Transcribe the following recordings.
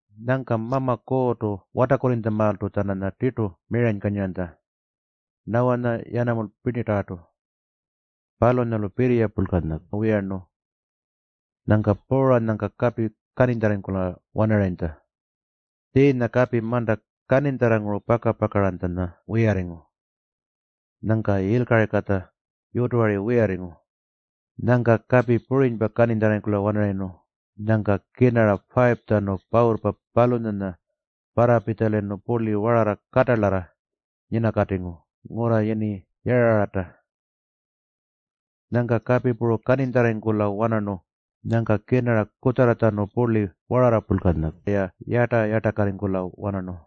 Nyangka Mama Kuurrtu watarrkurrinytjamaaltu-tjananya tirtu miranykanyiranytja Nawanya puru yanamulpa pirninyatarrartu. Palunyalu pirriya purlkanya wiyarnu. Nyangka puuranyangka kapi kaninytjarrarringkula-wanarayintja. Tjiinya kapi manta kaninytjarranguru paka-pakaranytjanya wiyarringu. Nyangka yilkaringkatja yutuwari wiyarringu. Nyangka kapi purinypa kaninytjarrarringkula-wanarayirnu, nyangka kirnara 5-tjanu pawurrpa palunyanya parrapitjalayirnu purli wararra katalarra nyinakatingu ngurra yini Yarararrta. Nyangka kapi puru kaninytjarrarringkula-wanarnu, nyangka kirnara kutjarratjanu purli wararra purlkanya-ya yarta-yartakarringkula-wanarnu.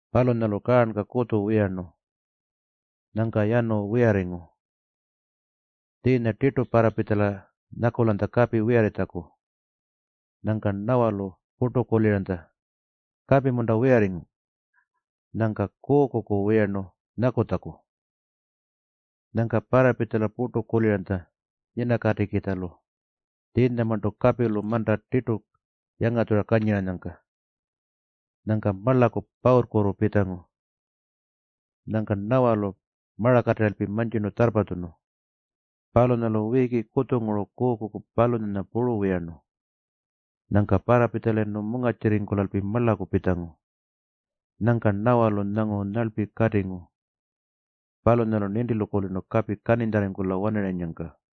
Palunyalu kaarnka kutju wiyarnu. Nyangka yanu wiyarringu. Tjiinya tirtu parrapitjala nyakulanytja kapi wiyarritjaku. Nyangka Nawalu purtu kuliranytja, “Kapi-munta wiyarringu?” Nyangka tjurlpu kuukuku wiyarnu nyakutjaku. Nyangka parrapitjala purtu kuliranytja nyinakatikitjalu tjiinyamarntu kapilu manta tirtu yangatjura kanyiranyangka. Nyangka marlaku pawurrkutu pitjangu. Nyangka Nawalu marakatirralpi mantjirnu tjarrpatjunu. Palunyalu wiiki kutjunguru kuukuku palunyanya puru wiyarnu. Nyangka parrapitjalayirnu mungarrtjirringkulalpi marlaku pitjangu. Nyangka Nawalu nyangu nyarlpi katingu. Palunyalu nintilu kulirnu kapi kaninytjarrarringkula-wanarayinnyangka.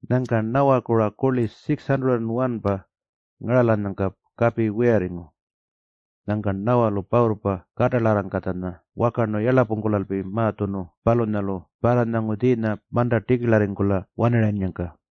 Nyangka Nawaku-ra kurli 601-pa ngaralanyangka kapi wiyarringu. Nyangka Nawalu pawurrpa katalarrangkatjanya wakarnu yarlapungkulalpi ma-tjunu palunyalu parranyangu tjiinya manta tikirlarringkula-wanarayinnyangka.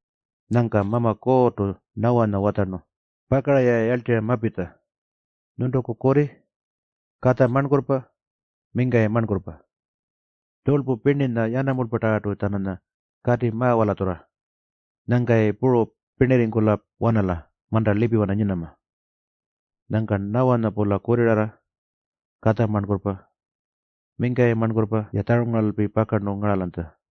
Nyangka Mama Kuurrtu Nawanya watjarnu, “Pakara-ya yarltirra mapitja, nyuntuku kurri, katja marnkurrpa puru mingkayi marnkurrpa. Tjurlpu pirninya puru yanamulpatarrartu-tjananya kati ma-walatjurra. Nyangka-yayi puru pirnirringkula-wanala manta lipiwana nyinama.” Nyangka Nawanya-pula kurrirarra, katja marnkurrpa puru mingkayi marnkurrpa-ya tjarungaralalpi pakarnu ngaralanytja.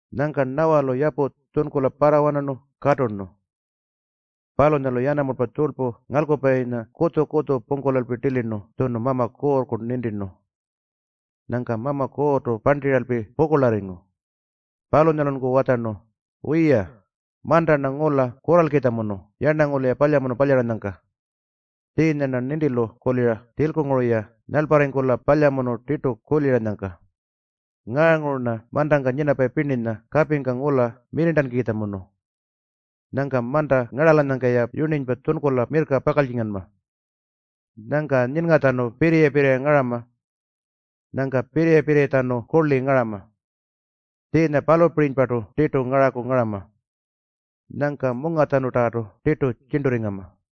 Nyangka Nawalu yapu tjunkula parrawanarnu katurnu. Palunyalu yanamulpa tjurlpu ngalkupayinya kutju-kutju pungkulalpi tilirnu tjunu Mama Kuurrku nintirnu. Nyangka Mama Kuurrtu parntiralpi pukurlarringu. Palunyalunku watjarnu, “Wiya, manta-rna ngula kurralkitjamunu yarnangulu-ya palyamunu palyaranyangka. Tjiinya-rna nintilu kulira tjilkunguru-ya nyalparringkula palyamunu tirtu kuliranyangka. Ngaanguru-rna mantangka nyinapayi pirninya kapingka mirrirntankukitjamunu. Nyangka manta ngaralanyangka-ya yurninypa tjunkula mirrka pakaltjinganma. Nyangka nyinngatjanu pirriya-pirriya ngarama. Nyangka pirriya-pirriyatjanu kurli ngarama. Tjiinya palunyapirinypartu tirtu ngaraku ngarama. Nyangka mungatjanutarrartu tirtu tjirnturringama.”